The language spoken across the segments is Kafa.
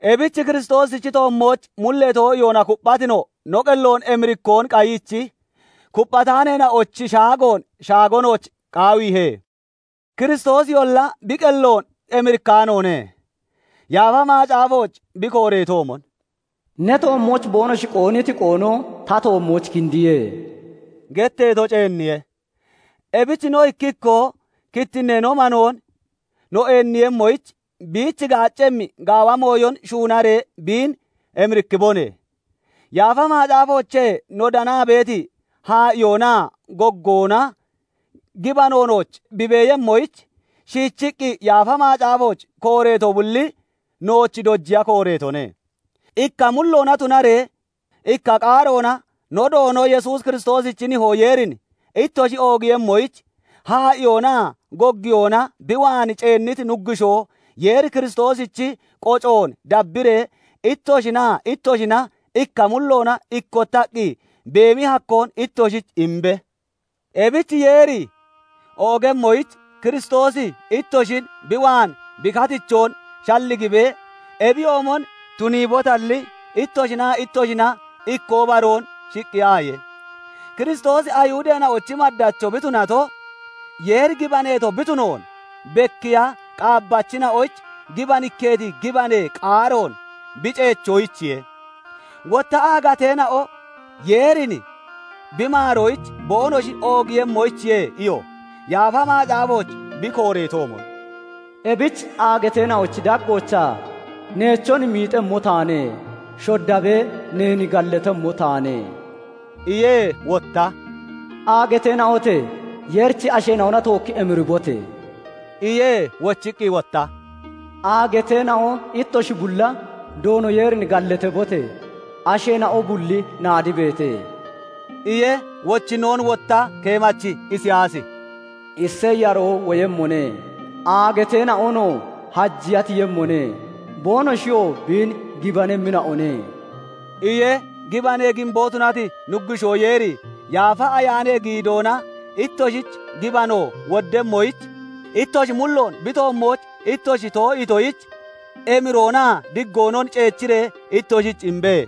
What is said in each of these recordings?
Ebich Kiristoosichi toommooch mullee too'iyoona kupphati no, no qelloon emirikkoon qayiichi kupphataaneena'ochi shaagoon shaago nooch qaawiihe. Kiristoosiyolla bi qelloon emirikkaanoone; Yaafa Macaafooch bi kooreetoomon, "Ne toommooch boonoshi qoonniti qoono ta toommooch kindiye" getteeto ceenniye. Ebich no ikki ikkoo kittinnee no manoon no eenniiyemmoyich biich gaaccemmi gaawa mooyon shuunaree biin emirikkibone. Yaafa Macaafoochee no danaa beeti haa'iyoonaa goggoona gibano nooch bi beeyemmoyich, shiichiqqi Yaafa Macaafooch kooreeto bulli nooch dojiya kooreetone. Ikka mulloona tunaree ikka qaaroona no Doono Yesuus Kiristoosichi Nihoo Yeerin ittoshi oogiiyemmoyich, haa'iyoonaa goggiyoona bi waan ceenniti Nuggushoo Yeeri Kiristoosichi qocoon dabbiree ittoshinaa ittoshina ikka mulloona ikkottaqqi beemi hakkoon ittoshich imbe. Ebich Yeeri oogemmoyich Kiristoosi ittoshin bi waan bi katichoon shalligibee ebiyoomon tuniibotalli, ittoshinaa ittoshina ikkoo baroon shiqqiyaaye. Kiristoosi Ayihudeena'ochi maddacho bi tunato, Yeeri gibaneeto bi tunoon bekkiiya qaabbachina'oyich gibanikkeeti gibanee qaaroon bi ceechoyichiye; wotta aagateena'o Yeerin bi maaroyich boonoshi oogiiyemmoyichiye iyo. Yaafa Macaafooch bi kooreetoomon, "Ebich aagateena'ochi daggoochaa neechon miixemmo taane; Shoddabee neen gallatemmo taane" iye. Wotta "Aagateena'ote! Yeerichi asheena'ona tookki emiribote!" iye. Wochiqqi wotta "Aagateena'o ittoshi bulla! Doono Yeerin gallatabote! Asheena'o bulli naadibeete" iye. Wochinnoon wotta keemachi Isiyaasi "Iseyi yaroo woyemmone; aagateena'onoo hajiya tiyemmone; boonoshiyoo biin gibanemmina'one" iye. Gibanee giimbo tunati Nuggushoo Yeeri Yaafa Ayaanee giidoona ittoshich gibano woddemmoyich ittoshi mulloon bi toommooch ittoshi too'iitoyich emiroonaa diggoonon ceechiree ittoshich imbe.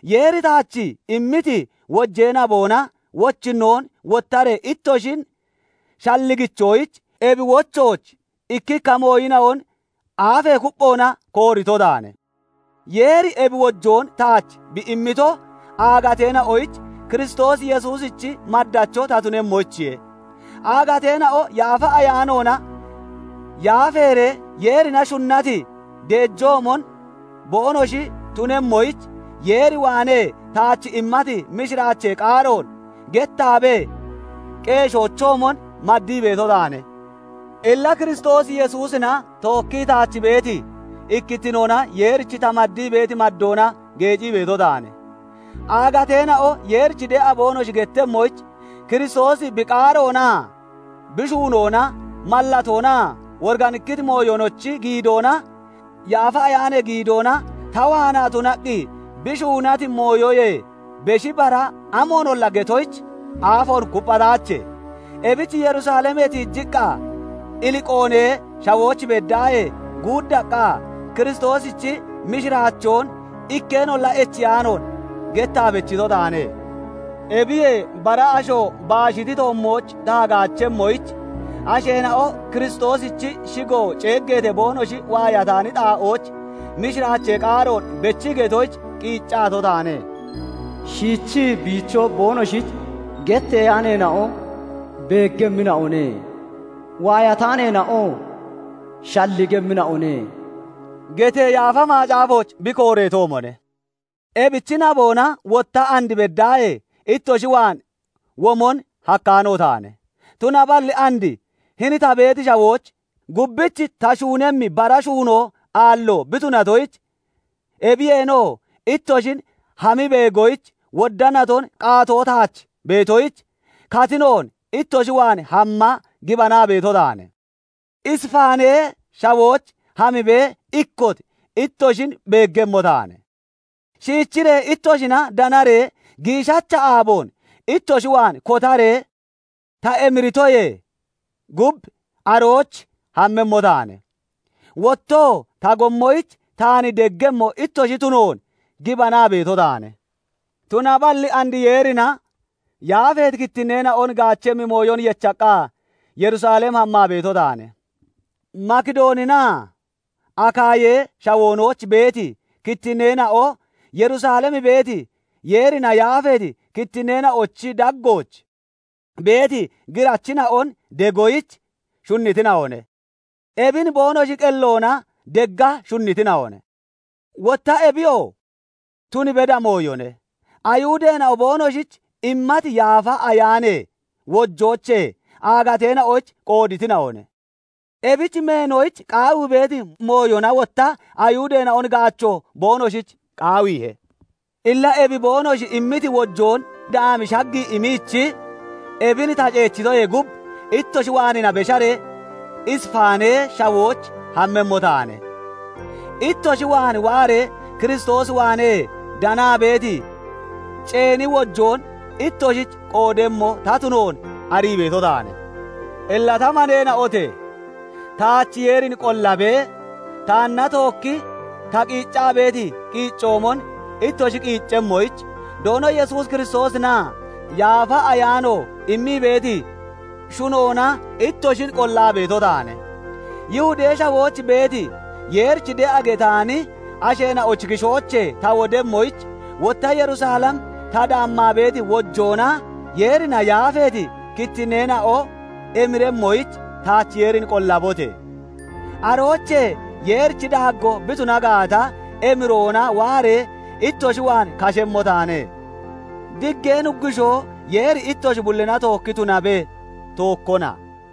Yeeri taach immiti wojee naboona wochinnoon wottaree ittoshin shalligichoyich ebi wochooch ikkikka mooyina'on aafee kupphoona koorito taane. Yeeri ebi wojoon taach bi immito aagateena'oyich Kiristoos Yesuusichi maddacho ta tunemmoyichiye. Aagateena'o Yaafa Ayaanoona yaafeeree Yeerina shunnati deejoomon boonoshi tunemmoyich, Yeer waanee taach immati mishiraachee qaaroon gettaabee qeeshoochoomon maddii beeto taane. Illa Kiristoos Yesuusina tookkii taach beeti ikkittinoona Yeerich ta maddii beeti maddoona geecii beeto taane. Aagateena'o Yeerich de'a boonoshi gettemmoyich, Kiristoosi bi qaaroonaa bi shuunoona, mallatoonaa woriganikkiti mooyonochi giidoona, Yaafa Ayaanee giidoona ta waanaa tunaqqi bi shuunati mooyoyee beshi bara amoonolla getoyich aafoon kupphataache. Ebich Yerusalemee tiijiqqa Iliqoonee Shawooch beddaahee guuddaqqa Kiristoosichi mishiraachoon ikkeenolla echiyaanoon gettaa bechito taane. Ebiyee bara asho baashiti toommooch ta hagaachemmoyich, asheena'o Kiristoosichi shigo ceeggeetee boonoshi waayataani xaa'ooch mishiraachee qaaroon bechii getoyich qiiccato taane. "Shiichii biicho boonoshich getteyaaneena'o beeggemmina'one; waayataaneena'oo shalligemmina'one" getee Yaafa Macaafooch bi kooreetoomone. Ebichi naboona wotta and beddaahee ittoshi waan womon hakkaano taane. Tunaballi and hini ta beeti shawooch gubbich ta shuunemmi bara shuunoo aallo bi tunatoyich, ebiyeenoo ittoshin hammii beegoyich wodda naton qaatoo taach beetoyich, katinoon ittoshi waan hamma gibanaa beeto taane. Isifaanee Shawooch hamibee ikkot ittoshin beeggemmo taane; shiichiree ittoshina danaree giishacha aaboon ittoshi waan kotaree ta emiritoyee gub, arooch hammemmo taane; wottoo ta gommoyich taan deggemmo ittoshi tunoon gibanaa beeto taane. Tunaballi and Yeerina yaafeeti kittinneena'on gaachemmi mooyon yechaqqa, Yerusalem hammaa beeto taane. Makidooninaa Akaayee Shawoonooch beeti kittinneena'o Yerusalem beeti, Yeerina yaafeeti kittinneena'ochi daggooch beeti girachina'on degoyich shunnitina'one. Ebin boonoshi qelloona degga shunnitina'one; wotta ebiyoo tun beda mooyone. Ayihudeena'o boonoshich immati Yaafa Ayaanee wojoochee aagateena'oyich qooditina'one; ebich meenoyich qaawii beeti mooyona wotta Ayihudeena'on gaacho boonoshich qaawiihe. Illa ebi boonoshi immiti wojoon daami shaggii imiichi ebin ta ceechitoyee gub, ittoshi waanina besharee Isifaanee Shawooch hammemmo taane. Ittoshi waan waaree Kiristoos waanee danaa beeti ceeni wojoon ittoshich qoodemmo ta tunoon arii beeto taane. Illa ta maneena'ote! Taach Yeerin qollabee, taanna tookki ta qiiccaa beeti qiiccoomon ittoshi qiiccemmoyich, Doono Yesuus Kiristoosinaa Yaafa Ayaano immii beeti shunoona ittoshin qollaa beeto taane. Yihudee Shawooch beeti, Yeerich de'a getaani asheena'ochi kishoochee ta wodemmoyich, wotta Yerusalem ta daammaa beeti wojoona Yeerina yaafeeti kittinneena'o emiremmoyich taach Yeerin qollabote! Aroochee Yeerichi daaggoo bi tuna gaata, emiroona waaree ittoshi waan kashemmo taane. Diggee Nuggushoo Yeeri ittoshi bullina tookki tunabe; tookkona.